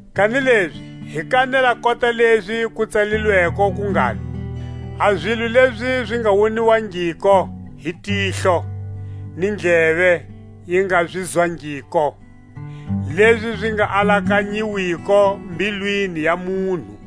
Kanilezi hi kanela kota lezi ku tsalilweko ku ngalo: A zilo lezi zi nga woniwangiko hi tihlo, ni ndleve yi nga zi zwangiko, Lezi zi nga alakanyiwiko mbilwini ya munhu,